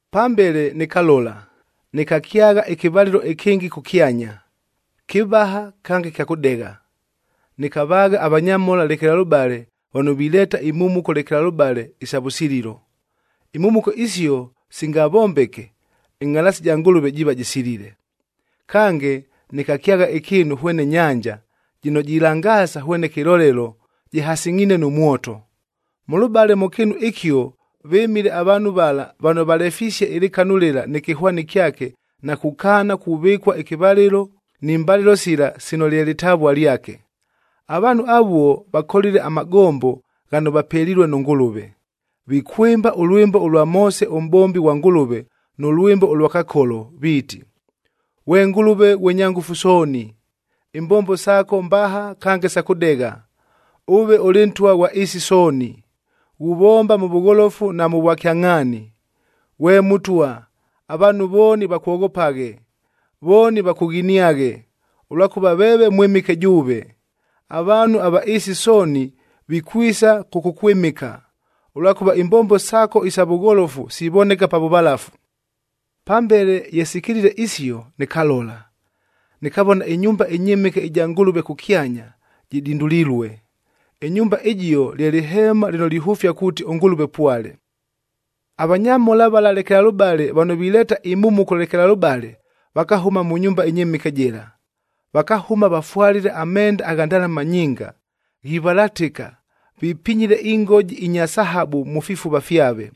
Pambele nɨkalola, nɨkakyagha ɨkɨvalɨlo ɨkɨngɨ kʉkyanya, kɨvaha kange kya kʉdegha. Nɨkavaagha avanyamhola lekelalʉbale vano vileeta imhumuko lekelalʉbale isa vʉsililo. Imhumuko isio singavombeke, ɨngʼhalaasi ja Ngʉlʉve jiiva jɨsilile. Kange, nɨkakyagha ɨkɨɨnu hwene nyanja, jɨno jilangaasa hwene kɨlolelo jɨhasɨngʼhiine nʉ mwoto. Mʉlʉbale mʉ kɨɨnu ɨkio vɨmile avaanhu vala vano valefisie ɨlɨkanu lɨla nɨ kɨhwani kyake na kukaana kuvɨkua ɨkɨvalɨlo ni mbalɨlo sila sino lye lɨtavua lyake. Avaanhu avuo vakolile amagombo ghano vapelilue nʉ Ngʉlʉve. Vikwɨmba ʉlwɨmbo ʉlwa Moose ʉmʼbombi ghwa Ngʉlʉvea nʉ lwɨmbo ʉlwa Kakolo viiti, “Ghwe Ngʉlʉve ghwe Nyangʉfu Sooni, imbombo saako mbaha kange sa kʉdegha. Ʉve ʉlɨ Ntwa ghwa ɨɨsi sooni, ghuvomba mʉ vʉgholofu na mʉ vwakyangʼhaani. Ghwe Mʉtwa, avaanhu vooni vakwoghopaghe, vooni vakʉghiniaghe, ʉlwakʉva veeve mwɨmɨke jʉʉve. Avaanhu ava ɨɨsi sooni vikwisa kʉkʉkwɨmɨka, ʉlwakʉva imbombo saako isa vʉgholofu sivoneka pa vʉvalafu.” Pambele ye sikilile isio nɨkalola, nɨkavona ɨnyumba ɨnyɨmɨke ɨja Ngʉlʉve kʉkyanya jɨdindulilue. Ɨnyumba ɨjio lye lɨheemab lɨno lihʉfia kuuti ʉNgʉlʉve pwale. Avanyamhola vala lekelalʉbale vano vileeta imhumuko lekelalʉbale vakahʉma mʉ nyumba ɨnyɨmɨke jɨla. Vakahʉma vafwalile amenda agha ndalama nyinga, ghivalatɨka, vipinyile ingoji inya sahabu mʉ fifuva fyave.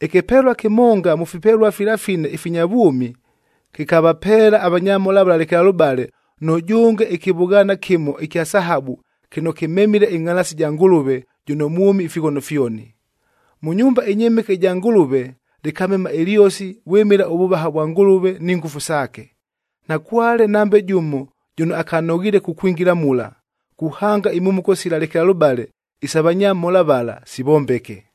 Ɨkɨpelua kɨmonga mʉ fipelua fila fine ifinya vwʉmi kɨkavapeela avanyamhola vala lekelalʉbale, nʉjʉnge ɨkɨvʉghaana kɨmo ɨkya sahabu kɨno kɨmemile ɨngʼhalaasi ɨja Ngʉlʉve jʉno mwʉmi ifighono fyoni. Mʉ nyumba ɨnyɨmɨke ɨja Ngʉlʉve lɨkamema ɨlyosi vwɨmɨla ʉvʉvaha vwa Ngʉlʉve ni ngʉfu saake. Nakwale nambe jʉmo jʉno akanoghiile kukwingila mula, kuhanga imhumuko sila lekelalʉbale isa vanyamhola vala sivombeke.